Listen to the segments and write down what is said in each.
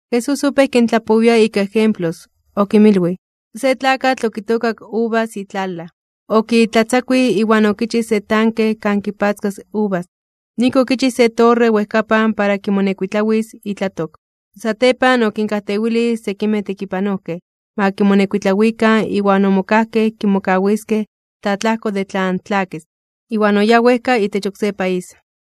Jesús opéj kintlapowia ika ejemplos, okinmilwij: ―Se tlakatl okitookak uvas itlalaj. Okitlatzakuij iwan okichij se tanke kan kipatzkas uvas. Noijki okichij se torre wejkapan para kimonekuitlawis itlatok. Satepan okinkajtewilij sekimej tekipanojkej ma kimonekuitlawikan iwan omokajkej kimokawiskej tlaatlajko de tlan tlakis, iwan oyáj wejka itech oksé país.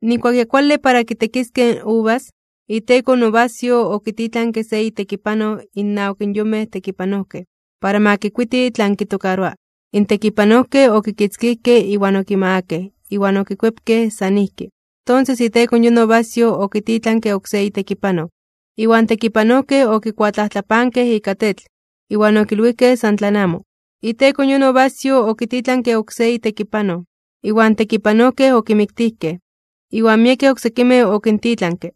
’Nijkuak ya kuale para kitekiskej in uvas, iteko in uvasyoj okititlanke se itekipanoj innawak in yonmej tekipanojkej, para ma kikuiti tlan kitokaroa. In tekipanojkej okikitzkijkej iwan okimagakej iwan okikuepkej san ijki. Tonses iteko yon uvasyoj okititlanke oksé itekipanoj, iwan tekipanojkej okikuatlajtlapankej ika tetl, iwan okilwijkej san tlan amo. Iteko yon uvasyoj okititlanke oksé itekipanoj, iwan tekipanojkej okimiktijkej. Iwan miekej oksekimej okintitlanke,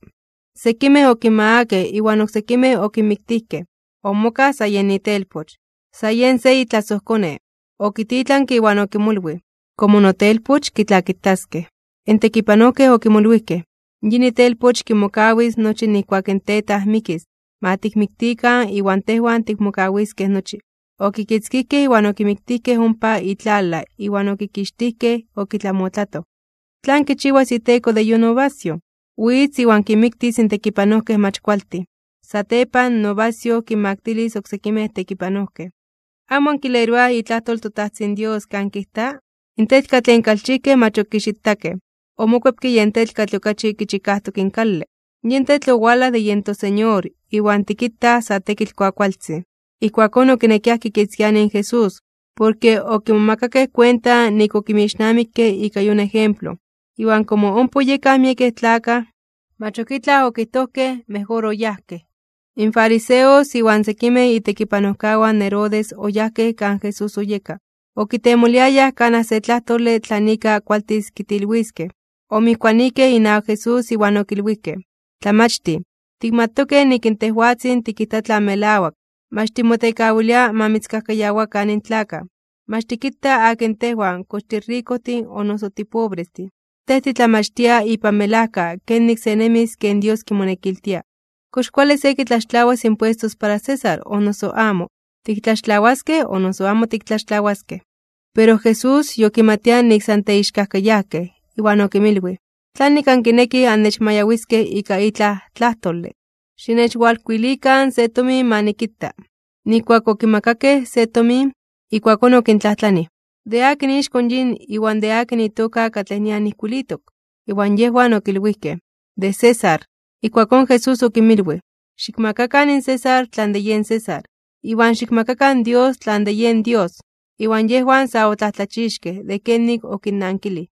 sekimej okinmagakej iwan oksekimej okinmiktijkej. ’Omokaj sa yen itelpoch, san yej se itlasojkone, okititlanke iwan okimolwij: “Komo notelpoch, kitlakitaskej.” In tekipanojkej okimolwijkej: “Yin itelpoch kimokawis nochi nijkuak in tetaj mikis, ma tikmiktikan iwan tejwan tikmokawiskej nochi.” Okikitzkijkej iwan okimiktijkej ompa itlalaj iwan okikixtijkej okitlamotlatoj. Ijkuakón Jesús okintlajtlanij: ―¿Tlan kichiwas iteko de yon uvasyoj? Witz iwan kinmiktis in tekipanojkej mach kualtin. Satepan in uvasyoj kinmaktilis oksekimej tekipanojkej. ’¿Amo ankileroaj itlajtol in toTajtzin Dios tlanon kijta? Sekan ijkin kijta: In tetl katlej in kalchijkej mach okixitakej, omokuepke yen tetl katlej okachi kichikajtok in kale. Yin tetl owalaj de yen toSeñor iwan tikitaj sa tekitl kuakualtzin. Ijkuakón okinekiaj kitzakuanij in Jesús, porke okimomakakej kuenta nik okinmixnamikke ika yon ejemplo. Iwan komo ompa oyekaj miekej tlakaj, mach ok itlaj okijtojkej, mejor oyajkej. In fariseos iwan sekimej itekipanojkawan in Herodes oyajkej kan Jesús oyeka. Okitemoliayaj kanaj se tlajtole tlan ika kualtis kitilwiskej. Omijkuanijkej inawak Jesús iwan okilwijkej: ―Tlamachtij, tikmatokej nik in tejwatzin tikijta tlan melawak, mach timotekawilia ma mitzkajkayawakan in tlakaj, mach tikita akin tejwan kox tirikojtin o noso tipobrestin. Tej titlamachtia ipan melajka kenik se nemis ken Dios kimonekiltia. ¿Kox kuale se kitlaxtlawas impuestos para César o noso amo? ¿Tiktlaxtlawaskej o noso amo tiktlaxtlawaskej? Pero Jesús yokimatia nik san teixkajkayajkej, iwan okinmilwij: ―¿Tlanik ankinekij annechmayawiskej ika itlaj tlajtole? Xinechwalkuilikan se tomin ma nikita. Nijkuak okimakakej se tomin, ijkuakón okintlajtlanij: ―¿De akin ixko yin iwan de akin itoka katlej nian ijkuilitok? Iwan yejwan okilwijkej: ―De César. Ijkuakón Jesús okinmilwij: ―Xikmakakan in César tlan de yen César, iwan xikmakakan Dios tlan de yen Dios. Iwan yejwan sa otlajtlachixkej (omomajmawtijkej) de kenik okinnankilij.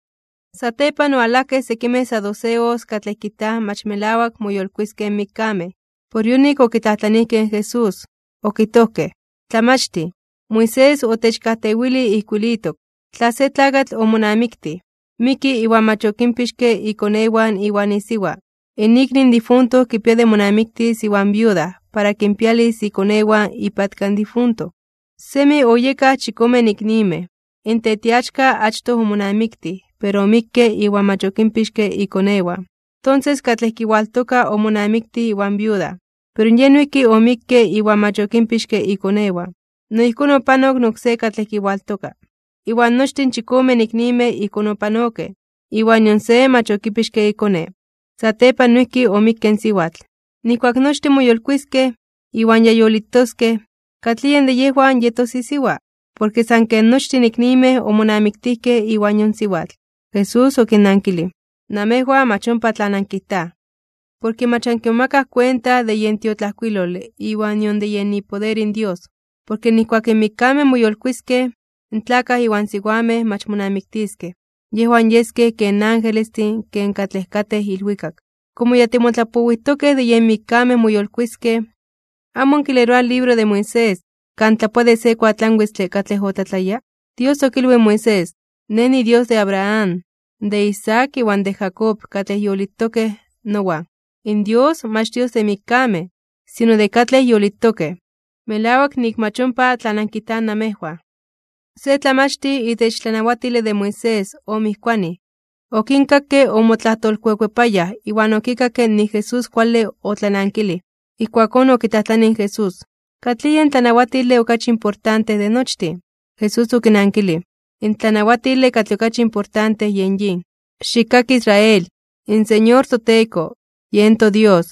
Satepan owalajkej sekimej saduceos katlej kijtaj mach melawak moyolkuiskej (moyolitiskej) in mikkamej. Por yonik okitlajtlanijkej in Jesús, okijtojkej: ―Tlamachtij, Moisés otechkajtewilij ijkuilitok, tla se tlakatl omonamiktij, miki iwan mach okinpixke ikonewan iwan isiwa, in ikni in difunto kipia de monamiktis iwan viuda para kinpialis ikonewan ipatka in difunto. Semi oyekaj, chikomen iknimej. In tetiachka achtoj omonamiktij pero omikke iwan mach okinpixke ikonewan. Tonses katlej kiwaltoka omonamiktij iwan viuda, pero yej noijki omikke iwan mach okinpixke ikonewan. No ijkón opanok in oksé katlej kiwaltoka. Iwan nochtin in chikomen iknimej ijkón opanokej, iwan nion se mach okipixke ikone. Satepan noijki omikke in siwatl. Nijkuak nochtin moyolkuiskej (moyolitiskej), iwan ya yolitoskej, ¿katlij yej de yejwan yetos isiwa? Porke san ken nochtin iknimej omonamiktijkej iwan yon siwatl. Jesús okinnankilij: ―Namejwan mach ompa tlan ankijtaj, porke mach ankimomakaj kuenta de yen tiotlajkuilole iwan nion de yen ipoder in Dios. Porke nijkuak in mikkamej moyolkuiskej (moyolitiskej), in tlakaj iwan siwamej mach monamiktiskej, yejwan yeskej ken angelestin ken katlej katej ilwikak. Komo ya timotlapowijtokej de yen mikkamej moyolkuiskej, ¿amo ankileroaj in libro de Moisés, kan tlapoa de se kuatlanwitztle katlej otlatlaya? Dios okilwij in Moisés: “Nej niDios de Abraham, de Isaac iwan de Jacob katlej yolitokej nowan.” ¡In Dios, mach Dios de mikkamej, sino de katlej yolitokej! Melawak nik mach ompa tlan ankijtaj namejwan. Se tlamachtij itech tlanawatile de Moisés omijkuanij, okinkakke omotlatlajtolkuepayaj iwan okikakke nik Jesús kuale otlanankilij. Ijkuakón okitlajtlanij in Jesús: ―¿Katlij yen tlanawatile okachi importante de nochtin? Jesús okinankilij: ―In tlanawatile katlej okachi importante yen yin: “Xikkaki, Israel, in Señor toTeko, yen toDios,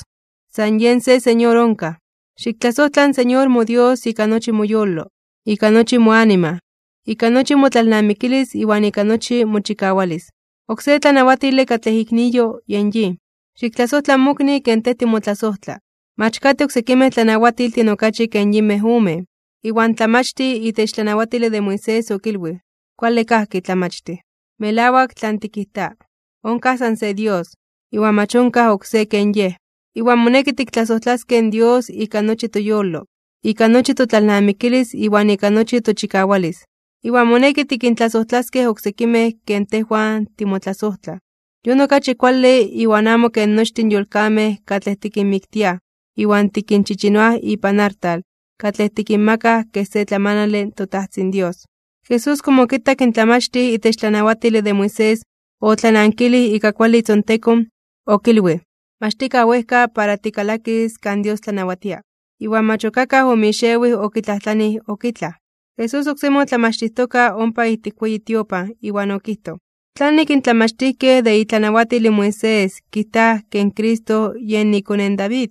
san Yej se Señor onkaj. Xiktlasojtla in Señor moDios ika nochi moyolo, ika nochi moanima, ika nochi motlalnamikilis iwan ika nochi mochikawalis.” Oksé tlanawatile katlej ikniyo yen yin: “Xiktlasojtla in mokni ken tej timotlasojtla.” Mach katej oksekimej tlanawatiltin okachi ken yinmej omen. Iwan tlamachtij itech tlanawatile de Moisés okilwij: ―Kuale kajki, Tlamachtij. Melawak tlan tikijta. Onkaj san se Dios, iwan mach onkaj oksé ken Yej. Iwan moneki tiktlasojtlaskej in Dios ika nochi toyolo, ika nochi totlalnamikilis iwan ika nochi tochikawalis. Iwan moneki tikintlasojtlaskej oksekimej ken tejwan timotlasojtlaj, yon okachi kuale iwan amo ken nochtin in yolkamej katlej tikinmiktiaj iwan tikinchichinoaj ipan artal katlej tikinmakaj kej se tlamanale in toTajtzin Dios. Jesús komo okitak in tlamachtij itech tlanawatile de Moisés otlanankilij ika kuale itzontekon, okilwij: ―Mach tikaj wejka para tikalakis kan Dios tlanawatia. Iwan mach ok akaj omixewij okitlajtlanij ok itlaj. Jesús oksemi otlamachtijtoka ompa ijtik weyi tiopan iwan okijtoj: ―¿Tlanik in tlamachtijkej de itlanawatil in Moisés kijtaj ke in Cristo yen ikone in David?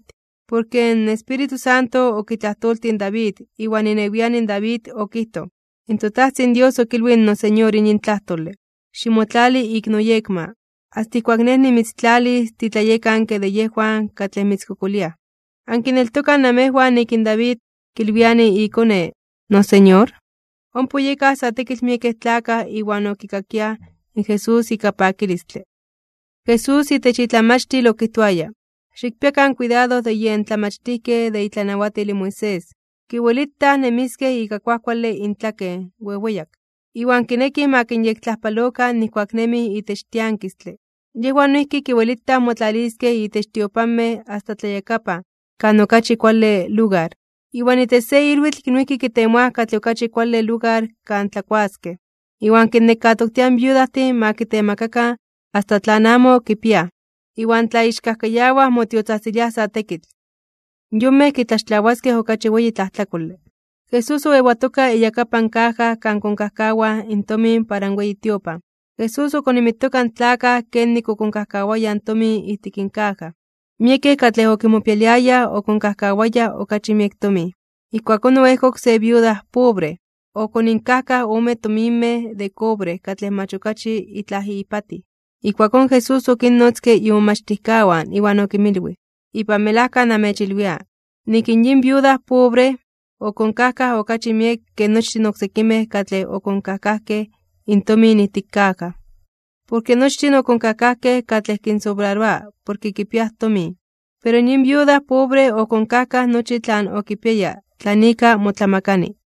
Porke in Espíritu Santo okitlajtoltij in David iwan inewian in David okijtoj: In toTajtzin Dios okilwij in noSeñor yin tlajtole: “Ximotlali ik noyekma, asta ijkuak Nej nimitztlalis titlayekanke de yejwan katlej mitzkokoliaj.” ¿Ankineltokaj namejwan nik in David kilwiani ikone noSeñor? Ompa oyekaj sa tekitl miekej tlakaj iwan okikakiaj in Jesús ika pakilistle. Jesús itech itlamachtil okijtoaya: ―Xikpiakan kuidado de yen tlamachtijkej de itlanawatil in Moisés, kiwelitaj nemiskej ika kuajkuale intlaken weweyak, iwan kinekij ma kinyektlajpalokan nijkuak nemij itech tiankistle. Yejwan noijki kiwelitaj motlaliskej itech tiopanmej asta tlayakapan kan okachi kuale lugar, iwan itech se ilwitl noijki kitemoaj katlej okachi kuale lugar kan tlakuaskej. Iwan kinnekatoktiaj in viudajtin ma kitemakakan asta tlan amo kipiaj, iwan tlaixkajkayawaj motiotzajtziliaj sa tekitl. Yonmej kitlaxtlawaskej okachi weyi tlajtlakole. Jesús oewatoka iyakapan kaja kan konkajkawaj in tomin para in weyi tiopan. Jesús okonimitoka in tlakaj kenik okonkajkawayaj in tomin ijtik in kaja. Miekej katlej okimopialiayaj okonkajkawayaj okachi miek tomin. Ijkuakón oejkok se viuda pobre, okoninkajkaj ome tominmej de cobre katlej mach okachi itlaj ipatij. Ijkuakón Jesús okinnotzke imomachtijkawan iwan okinmilwij: ―Ipan melajka namechilwia, nik in yin viuda pobre, okonkajkaj okachi miek ke nochtin oksekimej katlej okonkajkajkej intomin ijtik kaja. Porke nochtin okonkajkajkej katlej kinsobraroa porke kipiaj tomin, pero yin viuda pobre okonkajkaj nochi tlan okipiaya tlan ika motlamakani.